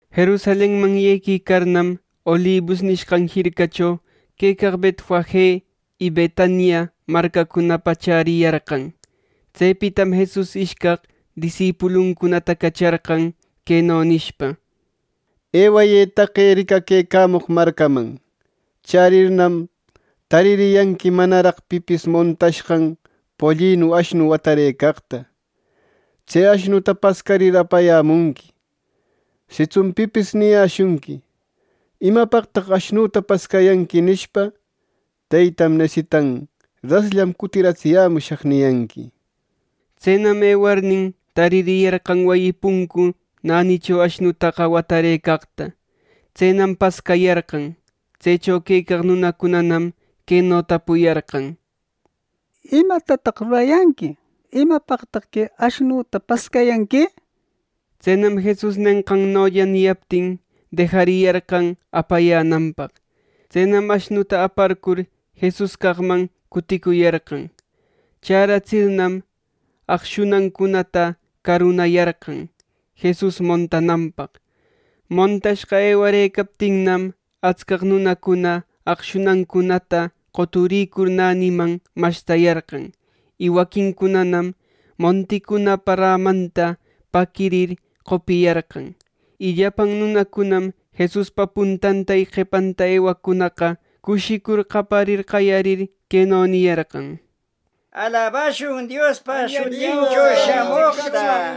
Jerusalenman yequicarnam, Olibus nishqan jircacho quecaq Betfage y Betania marcacunapa chäriyarqan. Tsepitam Jesus ishcaq disipuluncunata cacharqan, queno nishpa: —Ewayë taqe ricaquecamoq marcaman. Chärirnam, taririyanqui manaraq pipis montashqan pollinu ashnu watarëcaqta. Tse ashnuta pascarir apayämunqui. Sitsun pipis niyäshunqui: ‘¿Imapaqtaq ashnuta pascayanqui?’ nishpa, ‘Teytam nesitan. Rasllam cutiratsiyämushaq’ niyanqui. Tsenam ewarnin, taririyarqan wayi puncu nänicho ashnutaqa watarëcaqta. Tsenam pascayarqan. Tsecho quecaq nunacunanam queno tapuyarqan: —¿Imatataq rurayanqui? ¿Imapaqtaq que ashnuta pascayanqui? —nir. Tsenam Jesus nenqannolla niyaptin, dejariyarqan apayänanpaq. Tsenam ashnuta aparcur Jesus caqman cuticuyarqan. Chäratsirnam, aqshunancunata carunayarqan Jesus montananpaq. Montashqa ewarëcaptinnam, atscaq nunacuna aqshunancunata qoturïcur näniman mashtayarqan; y waquincunanam monticunapa rämanta paquirir qopiyarqan. Y llapan nunacunam Jesuspa puntanta y qepanta ewaqcunaqa, cushicur qaparir qayarir queno niyarqan: —¡Alabashun Diospa shutincho shamoqta!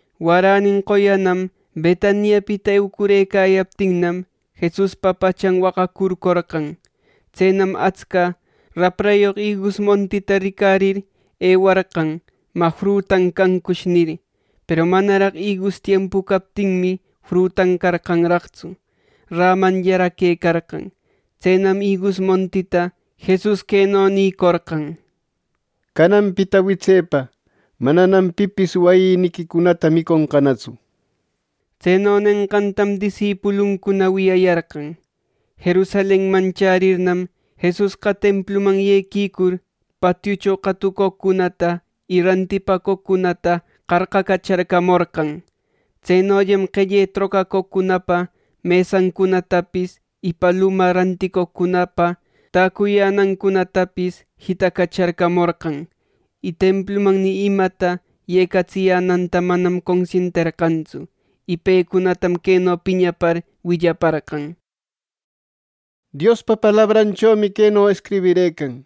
Waränin qoyanam Betaniapita eucurëcayaptin Jesuspa pachan waqacurcorqan. Tsenam atsca raprayoq igus montita ricarir ewarqan “¿Mä, frutan cancush?” nir. Peru manaraq igus tiempu captinmi, frutan carqanraqtsu. Rämanllaraq quecarqan. Tsenam igus montita Jesus queno nïcorqan: —Cananpita witsepa mananam pipis wayïniquicunata miconqanatsu. Tseno nenqantam disipuluncuna wiyayarqan. Jerusalenman chärirnam, Jesusqa templuman yequicur, patiucho qatucoqcunata y rantipacoqcunata qarqacacharcamorqan. Tsenollam qelle trocaqcunapa mesancunatapis y paluma ranticoqcunapa täcuyänancunatapis jitacacharcamorqan; y templuman ni imata yecatsiyänanta manam consienterqantsu. Y pecunatam queno piñapar willaparqan: —Diospa palabranchomi queno escribirëcan: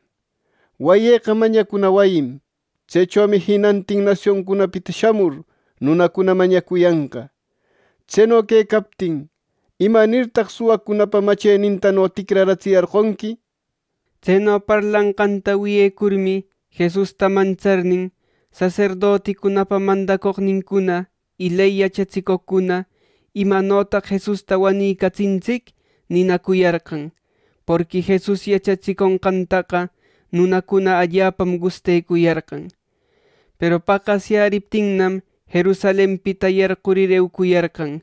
‘Wayïqa mañacuna wayim. Tsechomi jinantin nasioncunapita shamur nunacuna mañacuyanqa.’ Tseno quecaptin, ¿imanirtaq suwacunapa machenintano ticratsiyarqonqui! —nir. Tseno parlanqanta wiyecurmi, Jesusta mantsarnin saserdoticunapa mandacoqnincuna, ley yachatsicoqcuna “¿Imanotaq Jesusta wanicatsintsic?” ninacuyarqan, porqui Jesus yachatsiconqantaqa nunacuna allapam gustecuyarqan. Peru paqasyäriptinnam, Jerusalenpita yarqurir eucuyarqan.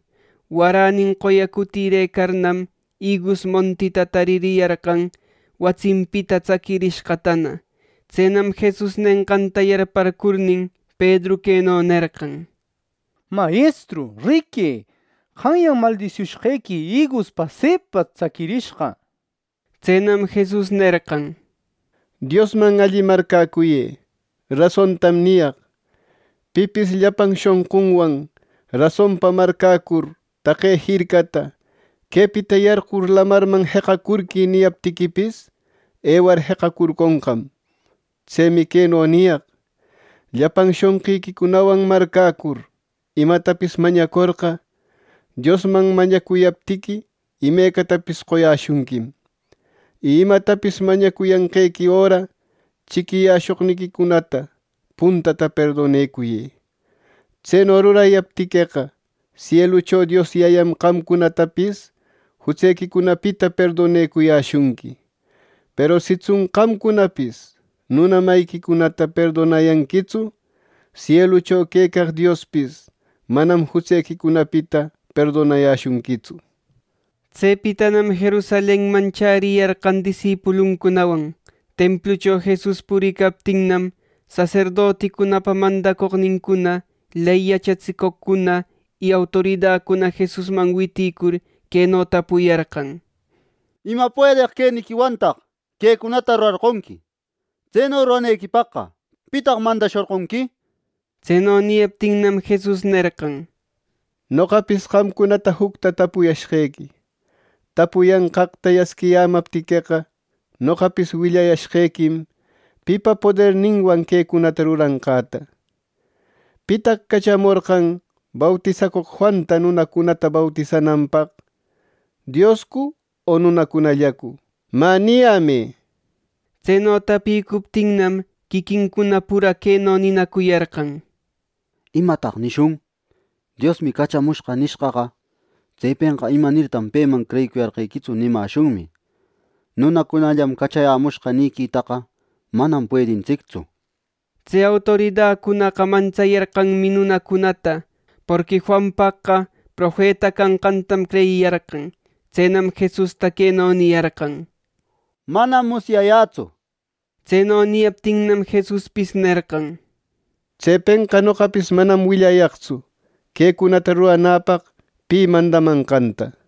Waränin qoya cutirëcarnam, igus montita taririyarqan watsinpita tsaquirishqatana. Tsenam Jesus nenqanta yarparcurnin, Pedru queno nerqan: —¡Mayestru, riquë! Qanyan maldisiushqequi igus pasepa tsaquirishqa —nir. Tsenam Jesus nerqan: —Diosman alli marcäcuyë. Rasontam niyaq. Pipis llapan shonqunwan rasonpa marcäcur taqe jircata ‘¡Quepita yarqur lamarman jeqacurquï!’ niyaptiquipis, ewar jeqacurconqam. Tsemi queno niyaq: Llapan shonqiquicunawan marcäcur imatapis mañacorqa, Diosman mañacuyaptiqui imecatapis qoyäshunquim. Y imatapis mañacuyanqequi öra, chiquiyäshoqniquicunata puntata perdonecuyë. Tseno rurayaptiqueqa, sielucho Dios Yayam qamcunatapis jutsequicunapita perdonayäshunqui. ˻Peru sitsun qamcunapis nuna mayiquicunata perdonayanquitsu, sielucho quecaq Diospis manam jutsequicunapita perdonayäshunquitsu.˼ Tsepitanam Jerusalenman chäriyarqan disipuluncunawan. Templucho Jesus puricaptinnam, saserdoticunapa mandacoqnincuna, ley yachatsicoqcuna y autoridacuna Jesusman witïcur, queno tapuyarqan: —¿Ima puedeq queniquiwantaq quecunata rurarqonqui! Tseno ruranequipaq ¿pitaq mandashorqonqui! —nir. Tseno niyaptinnam, Jesus nerqan: —Noqapis qamcunata jucta tapuyashqequi: Tapuyanqaqta yasquiyämaptiqueqa, noqapis willayäshqequim pipa poderninwan quecunata ruranqäta. ¿Pitaq cachamorqan bautisacoq Juanta nunacunata bautisananpaq, Dioscu o nunacunallacu? ¡Mä, niyämë! Tseno tapïcuptinnam, quiquincuna pura queno ninacuyarqan: —¿Imataq nishun? ‘Diosmi cachamushqa’ nishqaqa, tsepenqa ‘¿Imanirtaq peman creyiyarqequitsu!’ nimäshunmi. ‘Nunacunallam cachayämushqa nïquitaqa manam puedintsictsu’ —nir. Tse autoridacunaqa mantsayarqanmi nunacunata, porqui Juanpaqqa profeta canqantam creyiyarqan. Tsenam Jesusta queno niyarqan: —Manam musyayätsu —nir. Tseno niyaptinnam, Jesuspis nerqan: —Tsepenqa noqapis manam willayaqtsu quecunata ruranäpaq pi mandamanqanta —nir.